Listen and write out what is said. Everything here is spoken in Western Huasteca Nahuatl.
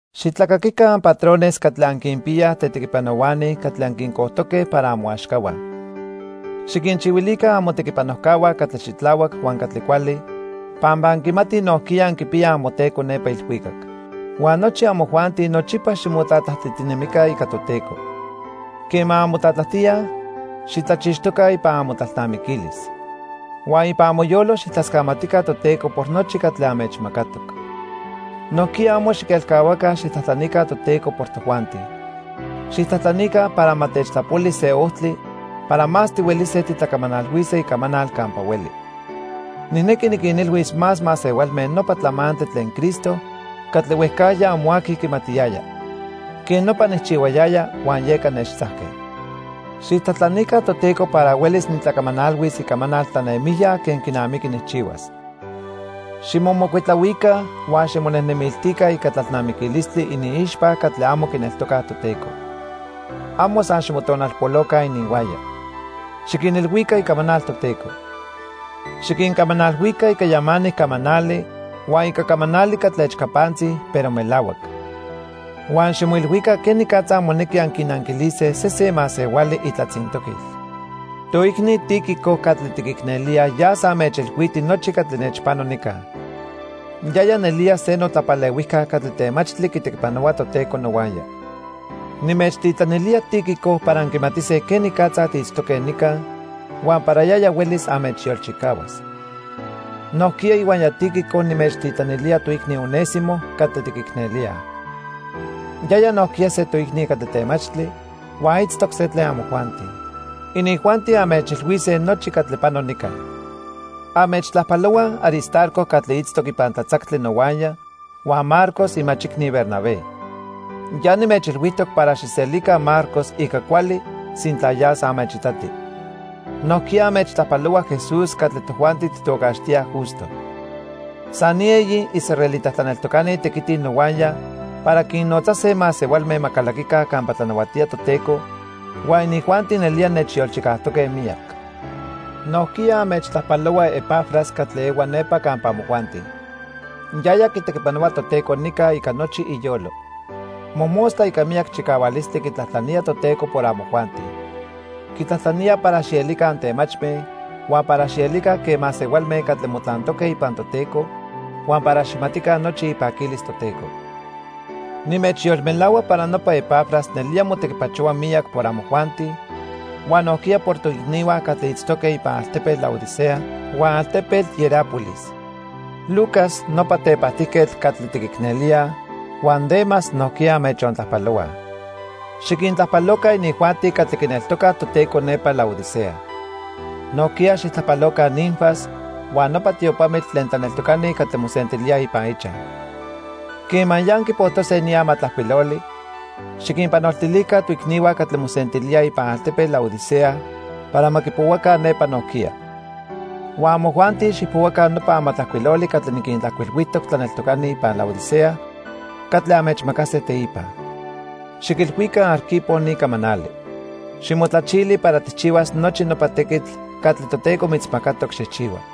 Xitlacaquica anpatrones catli anquinpiyaj tetequipanohuani catli anquincojtoque para amoaxcahua. Xiquinchihuilica amotequipanojcahua catli xitlahuac huan catli cuali pampa anquimatij nojquiya anquipiyaj amoTeco nepa ilhuicac. Huan nochi amojuanti nochipa ximotlatlajtijtinemica ica Toteco. Quema anmotlatlajtíaj, xijtlachixtoca ipan amotlalnamiquilis. Huan ipan amoyolo xijtlascamatica Toteco por nochi catli anmechmacatoc. Nojquiya amo xiquelcahuaca xijtlajtlanica Toteco por tojuanti. Xijtlajtlanica para ma techtlapoli se ojtli para más tihuelise titlacamanalhuise icamanal campa hueli. Nijnequi niquinilhuis más masehualme nopa tlamantli tlen Cristo catli huejcajya amo aqui quimatiyaya. Quej nopa nijchihuayaya huan yeca nechtzajque. Xijtlajtlanica Toteco para huelis nitlacamanalhuis icamanal tlanemijya quen quinamiqui nijchihuas. Ximomocuitlahuica huan ximonejnemiltica ica tlalnamiquilistli iniixpa catli amo quineltocaj Toteco. Amo san ximotonalpoloca ininhuaya. Xiquinilhuica icamanal Toteco. Xiquincamanalhuica ica yamanic camanali huan ica camanali catli echcapantzi, pero melahuac. Huan ximoilhuica quenicatza monequi anquinanquilise sesen masehuali itlatzintoquil. Toicni Tíquico catli tiquicnelíaj yas anmechilhuiti nochi catli nechpano nica. Yaya nelía se notlapalehuijca catli temachtli quitequipanohua Toteco nohuaya. Nimechtitlanilía Tíquico para anquimatise quenicatza tiitztoque nica huan para yaya huelis anmechyolchicahuas. Nojquiya ihuaya Tíquico nimechtitlanilía toicni Onésimo catli tiquicnelíaj. Yaya nojquiya se toicni catli temachtli huan itztoc se tlen amojuanti. Inijuanti anmechilhuise nochi catli pano nica. Anmechtlajpalohuaj Aristarco catli itztoc ipan tlatzactli nohuaya huan Marcos imachicni Bernabé. Ya nimechilhuijtoc para xijselica Marcos ica cuali sintla yas anmechitati. Nojquiya anmechtlajpalohua Jesús catli tojuanti tijtocaxtíaj Justo. San ni eyi israelita tlaneltocani tequitij nohuaya para quinnotzase masehualme ma calaquica campa tlanahuatía Toteco, huan inijuanti nelía nechyolchicajtoque miyac. Nojquiya anmechtlajpalohua Epafras catli ehua nepa campa amojuanti. Yaya quitequipanohua Toteco nica ica nochi iyolo. Mojmostla ica miyac chicahualistli quitlajtlanía Toteco por amojuanti. Quitlajtlanía para xielica antemachme, huan para xielica quen masehualme catli motlantoque ipan Toteco huan para ma xijmatica nochi ipaquilis Toteco. Nimechyolmelahua para nopa Epafras nelía motequipachohua miyac por amojuanti huan nojquiya por toicnihua catli itztoque ipan altepetl Laodicea huan altepetl Hierápolis. Lucas, nopa tepajtijquetl catli tiquicnelíaj, huan Demas nojquiya anmechontlajpalohuaj. Xiquintlajpaloca inijuanti catli quineltocaj Toteco nepa Laodicea. Nojquiya xijtlajpaloca Ninfas huan nopa tiopamitl tlen tlaneltocani catli mosentilíaj ipan ichaj. Quema ya anquipojtose ni amatlajcuiloli, xiquinpanoltilica toicnihua catli mosentilíaj ipan altepetl Laodicea para ma quipohuaca nepa nojquiya. Huan amojuanti xijpohuaca nopa amatlajcuiloli catli niquintlajcuilhuijtoc tlaneltocani ipan Laodicea catli anmechmacase teipa. Xiquilhuica Arquipo ni camanali: "Ximotlachili para tijchihuas nochi nopa tequitl catli Toteco mitzmacatoc xijchihua."